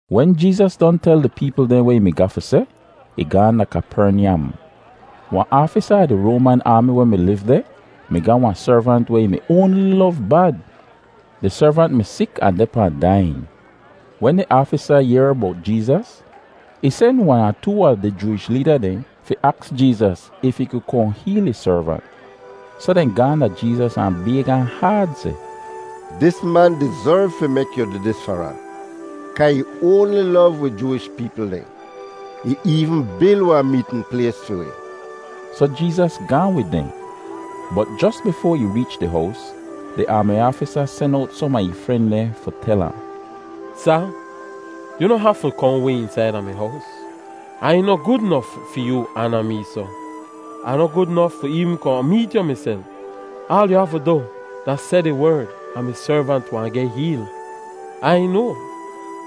Wen Jeezas don tel di peepl dehn weh ih mi ga fi seh, ih gaahn da Kapernyam. Wahn aafisa fahn di Roaman aami weh mi liv deh mi ga wahn servant weh ih mi oanli lov bad. Di servant mi sik ahn deh pahn daiyin. Wen di aafisa yehr bowt Jeezas, ih sen wan ahn too a di Jooish leeda dehn fi aks Jeezas if ih ku kohn heel ih servant. Soh dehn gaahn da Jeezas ahn bayg ahn haad seh, “Dis man dizerv fi mek yu du dis far ahn, kaa ih oanli lov wi Jooish peepl dehn. Ih eevn bil wahn meetn plays fi wi.” Soh Jeezas gaahn wid dehn. Bot jos bifoa ih reech di hows, di aami aafisa sen owt som a ih fren dehn fi tel ahn, “Sa, yu noh hafu kohn way eensaida mi hows. Ai noh gud nof fi yoo aana mee soh. Ah noh gud nof fi eevn kohn meet yu miself. Aal yu hafu du da seh di werd, ahn mi servant wahn geh heel. Ai noa,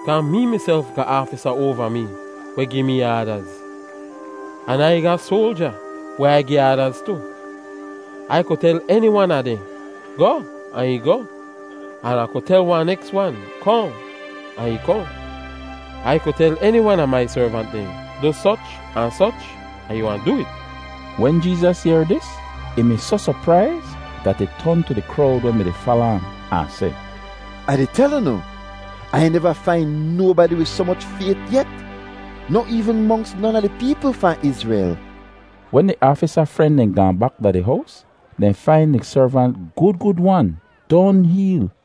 kaa mee miself ga aafisa oava mee weh gi mee aadaz, an Ai ga soalja weh Ai gi aadaz tu. Ai ku tel eni wan a dehn, ‘Goh!’ ahn ih goh. An Ah ku tel wahn neks wan, ‘Kohn!’ ahn ih kohn. Ai ku tel eni wan a mai servant dehn, ‘Du soch ahn soch,’ ahn ih wahn du it.” Wen Jeezas yehr dis, ih mi soh sopraiz dat ih ton tu di krowd weh mi-di fala ahn, ahn seh, “Ai di tel unu, Ai neva fain nobadi wid soh moch fayt yet, noh eevn monks non a di peepl fahn Izrel!” Wen di aafisa fren dehn gaahn bak da di hows, dehn fain di servant gud gud-wan, don heel.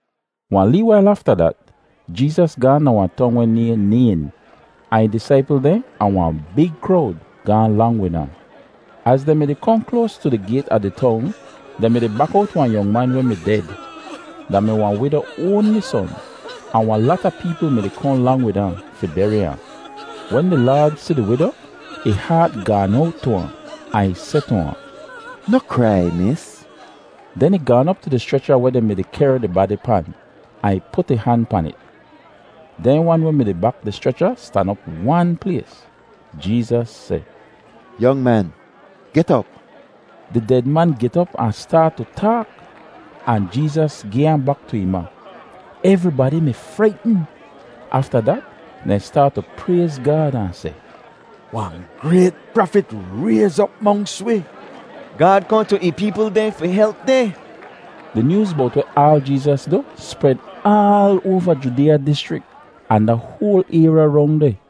Wahn lee wail afta dat, Jeezas gaahn da wahn tong weh nayhn Nayn, ahn ih disaipl dehn ahn wahn big krowd gaahn lang wid ahn. Az dehn mi-di kohn kloas tu di gayt a di tong, dehn mi-di bak owt wahn yong man weh mi ded. Da mi wahn wido oanli son, ahn wahn lata peepl mi-di kohn lang wid ahn fi beri ahn. Wen di Laad si di wido, ih haat gaan owt tu ahn, ahn ih seh tu ahn, “Noh krai, Mis.” Den ih gaan op tu di schrecha weh dehn mi-di kehr di badi pan, ahn ih put ih han pan it. Dehn wan weh mi-di bak di schrecha stan op wan plays. Jeezas seh, “Yong man, get op!” Di ded man get op ahn staat tu taak! Ahn Jeezas gi ahn bak tu ih ma. Evribadi mi fraitn. Afta dat dehn staat tu prayz Gaad ahn seh, “Wahn grayt prafit rayz op monks wi. Gaad kohn tu ih peepl dehn fi help dehn.” Di nyooz bowt aal weh Jeezas du spred aal oava Judeeya dischrik ahn da hoal ayrya rong deh.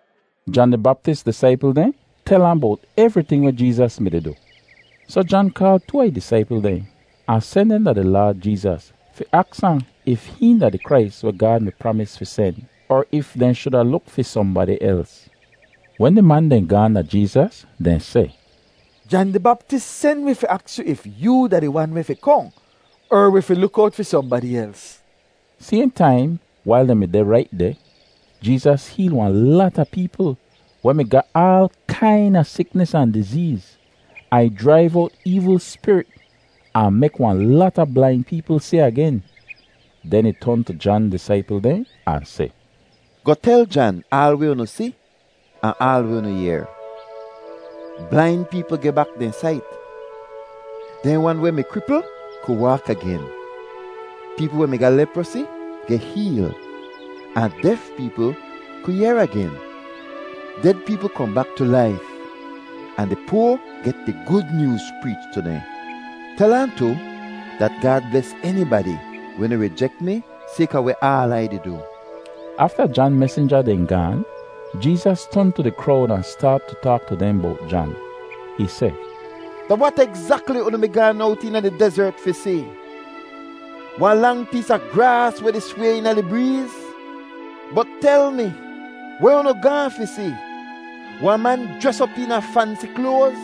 Jan di Baptis disaipl dehn tel ahn bowt evriting weh Jeezas mi-di du. Soh Jan kaal too a ih disaipl dehn ahn sen dehn da di Laad Jeezas fi aks ahn if hihn da di Krais weh Gaad mi pramis fi sen, er if dehn shuda luk fi sohnbadi els. Wen di man dehn gaahn da Jeezas, dehn seh, “Jan di Baptis sen wi fi aks yu if yoo da di wan weh fi kohn, er wi fi luk owt fi sohnbadi els.” Sayhn taim wail dehn mi deh rait deh, Jeezas heel wahn lata peepl weh mi ga aal kaina siknis ahn dizeez, ahn ih jraiv owt eevl spirit, ahn mek wahn lata blain peepl si agen. Den ih ton tu Jan disaipl dehn ahn seh, “Goh tel Jan aal weh unu si ahn aal weh unu yehr: Blain peepl geh bak dehn sait, dehn wan weh mi kripl ku waak agen, peepl weh mi ga leprosi geh heel, ahn def peepl ku yehr agen. Ded peepl kohn bak tu laif, ahn di poa geh di Gud Nyooz preech tu dehn. Tel ahn tu dat Gaad bles enibadi weh noh rijek mi sayka weh aal Ai di du.” Afta Jan mesinja dehn gaan, Jeezas ton tu di krowd ahn staat tu taak tu dehn bowt Jan. Ih seh, “Da wat egzakli unu mi gaan owt eena di dezert fi si? Wahn lang pees a graas weh di sway eena di breez? Bot tel mi, weh unu gaahn fi si? Wahn man jres op eena fansi kloaz?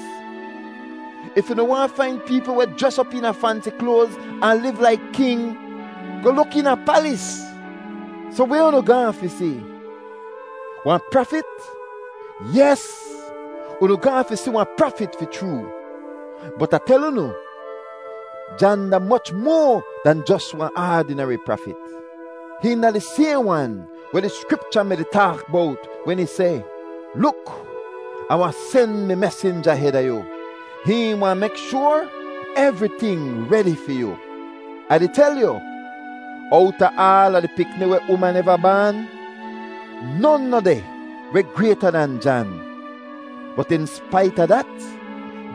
If unu waahn fain peepl weh jres op eena fansi kloaz ahn liv laik king, goh luk eena palis. Soh, weh unu gaahn fi si? Wahn prafit? Yes, unu gaahn fi si wahn prafit fi chroo, bot Ah tel unu, Jan da moch moa dahn jos wahn aadineri prafit. Hihn da di sayhn wan weh di Skripcha mi-di taak bowt wen ih seh, ‘Luk, Ah wahn sen mi mesinja heda yu. Hihn wahn mek shoar evriting redi fi yu.’ Ah di tel yu, owta aala di pikni weh uman eva baan, non noh deh weh grayta dan Jan; bot in spait a dat,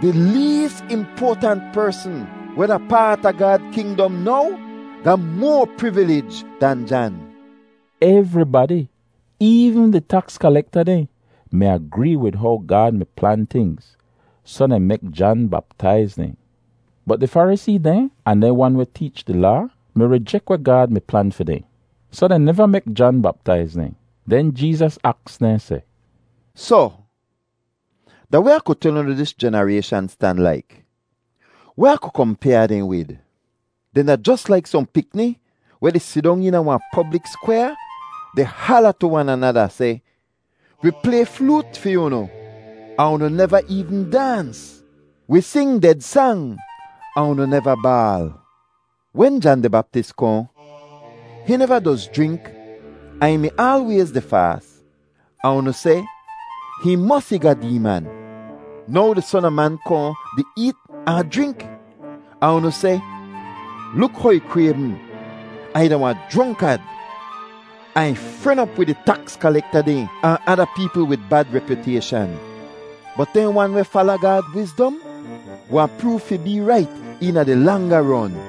di lees impoatant persn weh da paat a Gaad kingdom now ga moa privilij dan Jan.” Evribadi, eevn di taks kalekta dehn, mi agree wid how Gaad mi plan tingz, soh dehn mi mek Jan baptaiz dehn. Bot di Farisee dehn ahn dehn wan weh teech di Laa mi rijek weh Gaad mi plan fi dehn, soh dehn neva mek Jan baptaiz dehn. Den Jeezas aks dehn seh, “Soh, da weh Ah ku tel unu dis jenarayshan stan laik? Weh Ah ku kompyaa dehn wid? Dehn da jos laik sohn pikni weh di sidong eena wahn poblik skwyaa di hala tu wan anada seh, ‘Wi play floot fi unu ahn unu neva eevn daans. Wi sing ded sang ahn unu neva baal.’ Wen Jan di Baptis kohn, hihn neva doz jrink ahn ih mi aalwayz di faas, ahn unu seh, ‘Hihn mosi ga deeman.’ Now di Son a Man kohn di eet ahn jrink, ahn unu seh, ‘Luk how ih kraybm ahn ih da wahn jronkad, ahn ih fren op wid di taks kalekta dehn ahn ada peepl wid bad repyutayshan.’ Bot dehn wan weh fala Gaad wizdom wahn proov fi bee rait eena di langa ron.”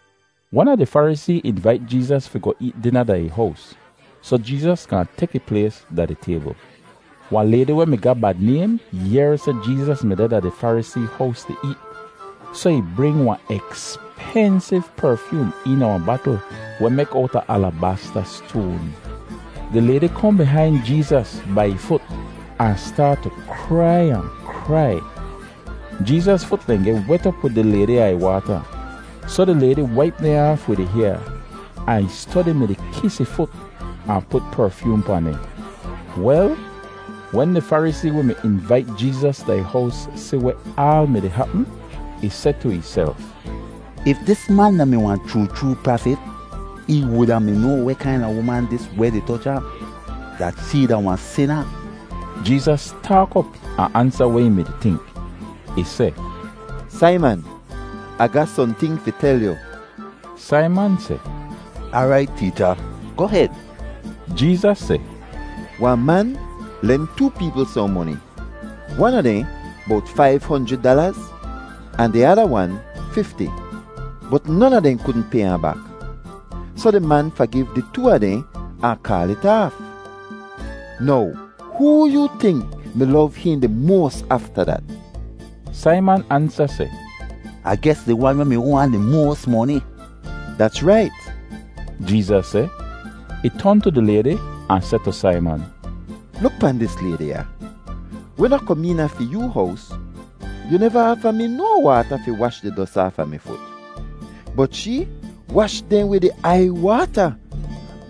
Wan a di Farisee invait Jeezas fi goh eet dina da ih hows, soh Jeezas gaahn tek ih plays da di taybl. Wel, wahn laydi weh mi ga bad naym yehr seh Jeezas mi deh da di Farisee hows di eet, soh ih bring wahn ekspensiv perfyoom eena wahn batl weh mek owta alabasta stoan. Di laydi kohn bihain Jeezas bai ih fut ahn staat tu krai ahn krai. Jeezas fut dehn geh wet op wid di laydi aiywaata, soh di laydi waip dehn aaf wid ih hyaa, ahn ih stodi mi-di kis ih fut ahn put perfyoom pahn dehn. Wel, wen di Farisee weh mi invait Jeezas da ih hows si weh aal mi-di hapm, ih seh tu ihself, “If dis man da-mi wahn chroo chroo prafit, ih wuda mi noa weh kaina uman dis weh di toch ahn, dat shee da wahn sina.” Jeezas taak op ahn ansa weh ih mi-di tink. Ih seh, “Saiman, Ah ga sohnting fi tel yu.” Saiman seh, “Aarait Teecha, goh hed.” Jeezas seh, “Wahn man len too peepl sohn moni; wan a dehn bowt faiv honjrid dalaz, ahn di ada wan, fifti. Bot non a dehn kudn pay ahn bak, soh di man fagiv di too a dehn ahn kaal it aaf. Now hoo yoo tink mi lov hihn di moas afta dat?” Saiman ansa seh, “Ah ges di wan weh mi hoa ahn di moas moni.” “Dats rait,” Jeezas seh. Ih ton tu di laydi ahn seh tu Saiman, “Luk pahn dis laydi ya. Wen Ah kom eena fi yoo hows, yu neva aafa mi no waata fi wash di dos aafa mi fut, bot shee wash dehn wid ih aiywaata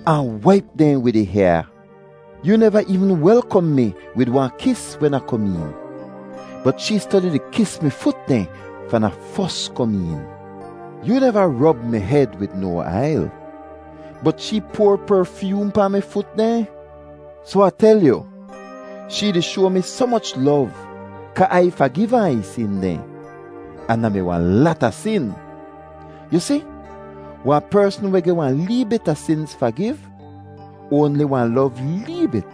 ahn waip dehn wid ih hyaa. Yoo neva eevn welkom mi wid wahn kis wen Ah kom een, bot shee stodi di kis mi fut dehn fahn Ah fos kom een. Yoo neva rob mi hed wid no ail, bot shee poar perfyoom pahn mi fut dehn. Soh Ah tel yu, shee di shoa mi soh moch lov kaa Ai fagiv ahn a ih sin dehn, ahn da mi wahn lata sin. Yu si, wahn persn weh geh wahn lee bit a sinz fagiv oanli wahn lov lee bit.”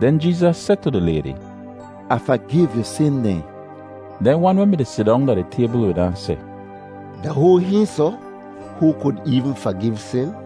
Den Jeezas seh tu di laydi, “Ah fagiv yu sin dehn.” Dehn wan weh mi-di sidong da di taybl wid ahn seh, “Da hoo hihn soh hoo kud eevn fagiv sin?”